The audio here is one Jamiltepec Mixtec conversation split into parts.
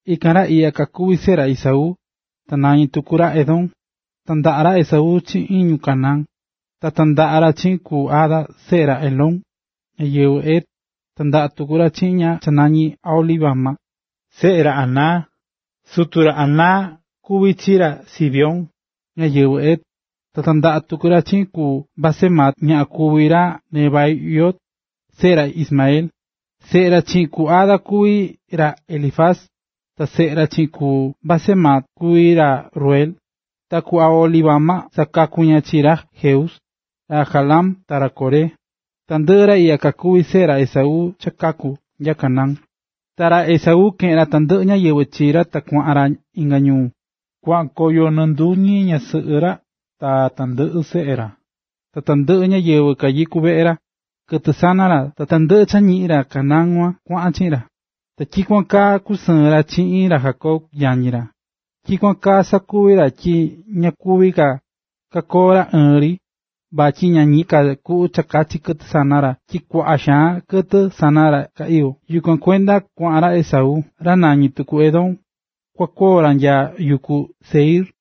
Ikan ra iꞌya kakuví seꞌe ra Esaú, (ta nañí tuku ra Edom). Tandaꞌa̱ ra Esaú chiꞌin ñu Canaán. Ta tandaꞌa̱ ra chiꞌin ku Ada seꞌe ra Elón, ñáyɨvɨ Het, tandaꞌa̱ tuku ra chiꞌin ña cha nañí Aholibama, seꞌe ra Aná. Sutu ra Aná kuví chi ra Zibeón, ñáyɨvɨ Hev. Ta tandaꞌa̱ tuku ra chiꞌin ku Basemat ñaꞌan kuꞌva ra Nebaiot, seꞌe ra Ismael. Seꞌe ra chiꞌin ku Ada kuví ra Elifaz, ta seꞌe ra chiꞌin ku Basemat kuví ra Reuel. Ta ku Aholibama sakaku̱ ña chi ra Jeús, ra Jaalam ta ra Coré. Tandɨꞌɨ ra iꞌya kakuví seꞌe ra Esaú cha kaku̱ nya Canaán. Ta ra Esaú keꞌe̱n ra tandɨꞌɨ ñáyɨvɨ chi ra ta kuaꞌan ra inga ñuu. Kuaꞌan koyo nɨɨ nduñi ñasɨꞌɨ ra ta tandɨꞌɨ seꞌe ra, tandɨꞌɨ ñáyɨvɨ kanyikú veꞌe ra, kɨtɨ sana ra, ta tandɨꞌɨ cha ñiꞌi̱n ra Canaán kuan kuaꞌan chiꞌin ra. Ta tyikuan kaa kusɨɨ̱n ra chiꞌin ra Jacob, yañi ra. Tyikuan kaa sakuvi̱ ra tyi ña kuví ka kakoo ra ɨɨn ri vatyi ña ñiꞌin ka kuꞌu kakachi kɨtɨ sana ra tyi kuaꞌa xaan kɨtɨ sana ra ka iyó. Yukuan kuenda kuaꞌan ra Esaú, ra nañí tuku Edom, kua koo ra nya yuku Seir.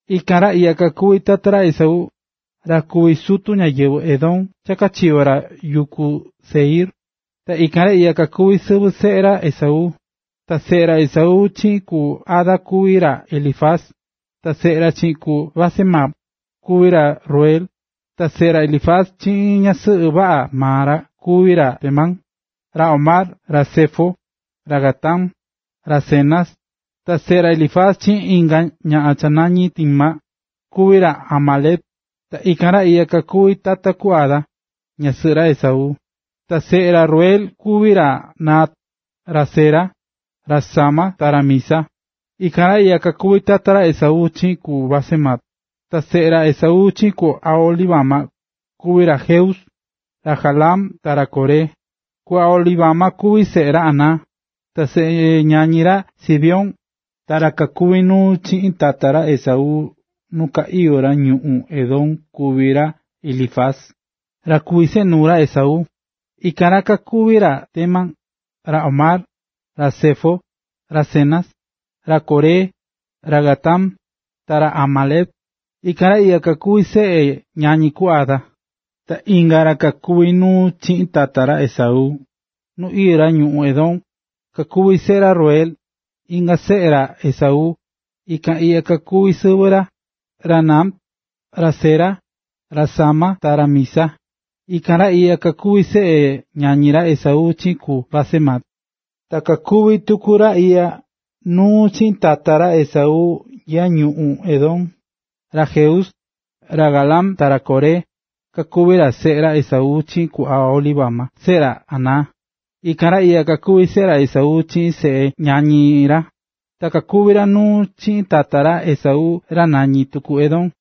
Ikan ra iꞌya kakuví tata ra Esaú, ra kuví sutu ñáyɨvɨ Edom cha kachiyo̱ ra yuku Seir. Ta ikan iꞌya kakuví sɨvɨ seꞌe ra Esaú. Ta seꞌe ra Esaú chiꞌin ku Ada kuví ra Elifaz, ta seꞌe ra chiꞌin ku Basemat kuví ra Reuel. Ta seꞌe ra Elifaz chiꞌin ñasɨꞌɨ vaꞌa maa ra kuví ra Temán, ra Omar, ra Zefo, ra Gatam, ra Cenaz. Ta seꞌe ra Elifaz chiꞌin inga ñaꞌan cha nañí Timna, kuví ra Amalec. Ta ikan ra iꞌya kakuví tata ku Ada, ñasɨꞌɨ ra Esaú. Ta seꞌe ra Reuel kuví ra Nahat, ra Zera, ra Sama ta ra Miza. Ikan ra iꞌya kakuví tata ra Esaú chiꞌin ku Basemat. Ta seꞌe ra Esaú chiꞌin ku Aholibama, kuví ra Jeús, ra Jaalam ta ra Coré. Ku Aholibama kuví seꞌe ra Aná, ta seꞌe ñañi ra Zibeón, Ta ra kakuví nuu chiꞌin tata ra Esaú nu ka iyó ra ñuꞌún Edom kuví seꞌe ra Elifaz, ra kuví seꞌe nuu ra Esaú. Ikan ra kakuví ra Temán, ra Omar, ra Zefo, ra Cenaz, ra Coré, ra Gatam, ta ra Amalec. Ikan ra iꞌya kakuví seꞌe ñañi ku Ada. Ta inga ra kakuví nuu chiꞌin tata ra Esaú, nu iyó ra ñuꞌún Edom, kakuví seꞌe ra Reuel, inga seꞌe ra Esaú. Ikan iꞌya kakuví sɨvɨ ra: ra Nahat, ra Zera, ra Sama ta ra Miza. Ikan ra iꞌya kakuví seꞌe ñañi ra Esaú chiꞌin ku Basemat. Ta kakuví tuku ra iꞌya nuu chiꞌin tata ra Esaú nya ñuꞌún Edom: ra Jeús, ra Jaalam ta ra Coré, kakuví ra seꞌe ra Esaú chiꞌin ku Aholibama seꞌe ra Aná. Ikan ra iꞌya kakuví seꞌe ra Esaú, chiꞌin seꞌe ñañi ra, ta kakuví ra nuu chiꞌin tata ra Esaú ra nañi tuku Edom.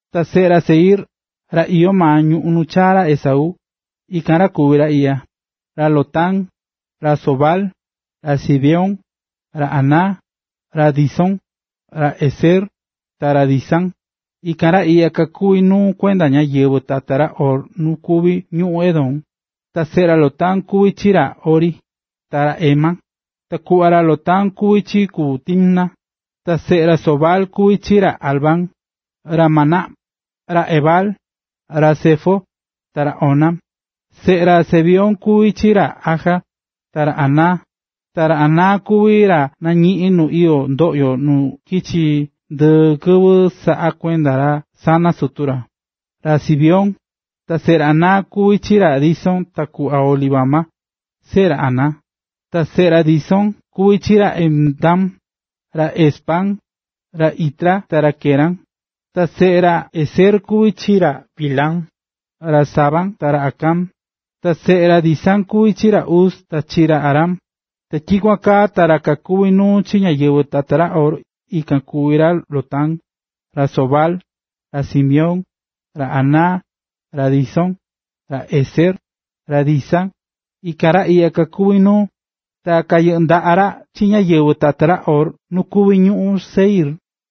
Ta seꞌe ra Seir, ra iyó maa ñuu nu chaa̱ ra Esaú, ikan kuví ra iꞌya: ra Lotán, ra Sobal, ra Zibeón, ra Aná, ra Disón, ra Ezer, ta ra Disán. Ta ikan ra iꞌya kakuví nuu kuenda ñáyɨvɨ tata ra Hor nu kuví ñuꞌún Edom. Ta seꞌe ra Lotán kuví chi ra Hori, ta ra Hemam. Ta kuꞌva ra Lotán kuvi chi ku Timna. Ta seꞌe ra Sobal kuví chi ra Alván, ra Manahat, ra Ebal, ra Sefo, ta ra Onam. Seꞌe ra Zibeón kuví chi ra Aja, ta ra Aná. Ta ra Aná kuví ra nañiꞌi̱n nu iyó ndoꞌyo nu chiki ndɨɨ kɨvɨ saꞌá kuenda ra burru sana sutu ra, ra Zibeón. Ta seꞌe ra Aná kuví chi ra Disón ta ku Aholibama, seꞌe ra Aná. Ta seꞌe ra Disón kuví chi ra Hemdán, ra Esbán, ra Itrán ta ra Querán. Ta seꞌe ra Ezer kuví chi ra Bilhán, ra Zaaván ta ra Acán. Ta seꞌe ra Disán kuví chi ra Uz ta chi ra Arán. Ta tyikuan kaa ta ra kakuví nuu chi ñáyɨvɨ tata ra Hor, ikan kuví ra Lotán, ra Sobal, ra Zibeón, ra Aná, ra Disón, ra Ezer, ra Disán, ikan ra iꞌya kakuví nuu, ta kayɨꞌɨ́ ndaꞌa ra chi ñáyɨvɨ tata ra Hor nu kuví ñuꞌún Seir.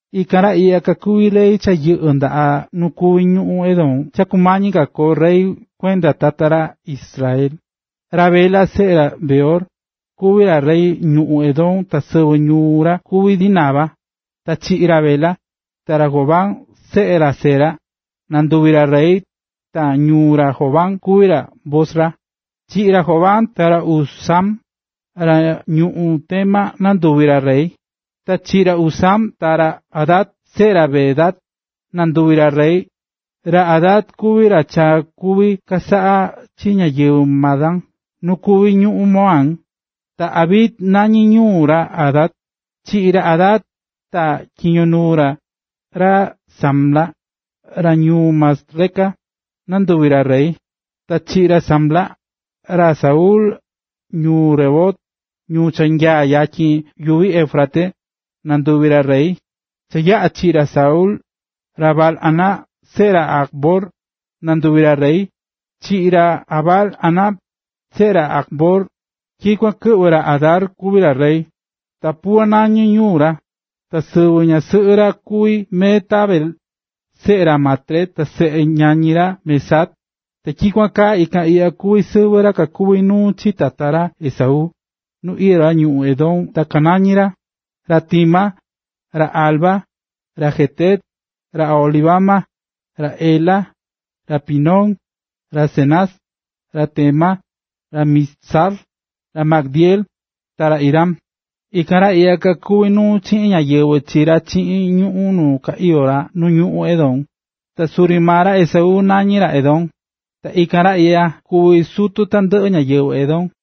Ikan ra iꞌya ra kakuvi̱ rey cha yɨꞌɨ̱ ndaꞌa nu kuví ñuꞌún Edom cha kumañi ka koo rey kuenda tata ra Israel. Ra Bela, seꞌe ra Beor, kuvi̱ ra rey ñuꞌún Edom ta sɨvɨ ñuu ra kuvi̱ Dinaba. Ta chiꞌi̱ ra Bela, ta ra Jobab, seꞌe ra Zera, nanduvi̱ ra rey, ta ñuu ra Jobab kuvi Bosra. Chiꞌi̱ ra Jobab, ta ra Husam, ra ñuꞌún Temán, nanduvi̱ ra rey. Ta chiꞌi̱ ra Husam, ta ra Hadad, seꞌe ra Bedad, nanduvi̱ ra rey. Ra Hadad kuvi̱ ra cha kuvi̱ chasaꞌa chi ñáyɨvɨ Madián nu kuví ñuꞌún Moab. Ta Avit nañí ñuu ra Hadad. Chiꞌi̱ ra Hadad, ta tyiño nuu ra, ra Samla, ra ñuu Masreca, nanduvi̱ ra rey. Ta chiꞌi̱ ra Samla, ra Saúl, ra ñuu Rehobot, ñuu cha nyaá yatyin yuvi Éufrates, nanduvi̱ ra rey. Cha yaꞌa̱ chiꞌi̱ ra Saúl, ra Baal-hanán, seꞌe ra Acbor, nanduvi̱ rey. Chiꞌi̱ ra Baal-hanán, seꞌe ra Acbor, tyikuan ta kɨꞌvɨ̱ ra Hadar kuvi̱ ra rey, ta Pau nañí ñuu ra, ta sɨvɨ ñasɨꞌɨ ra kuví Mehetabel, seꞌe ra Matred ta seꞌe ñañi ra Mezaab. Ta tyikuan kaa ikan iꞌya kuví sɨvɨ ra kakuví nuu chi tata ra Esaú, nu iyó ra ñuꞌún Edom ta kanañí ra: Ra Timna, ra Alva, ra Jetet, ra Aholibama, ra Ela, ra Pinón, ra Cenaz, ra Temán, ra Mibzar, ra Magdiel, ta ra Iram. Ikan ra iꞌya kakuví nuu chiꞌin ñáyɨvɨ chi ra chiꞌin ñuꞌún nu kachiyo̱ ra nu ñuꞌún Edom. Ta suri maa ra Esaú nañí ra Edom. Ta ikan ra iꞌya kuví sutu tandɨꞌɨ ñáyɨvɨ Edom.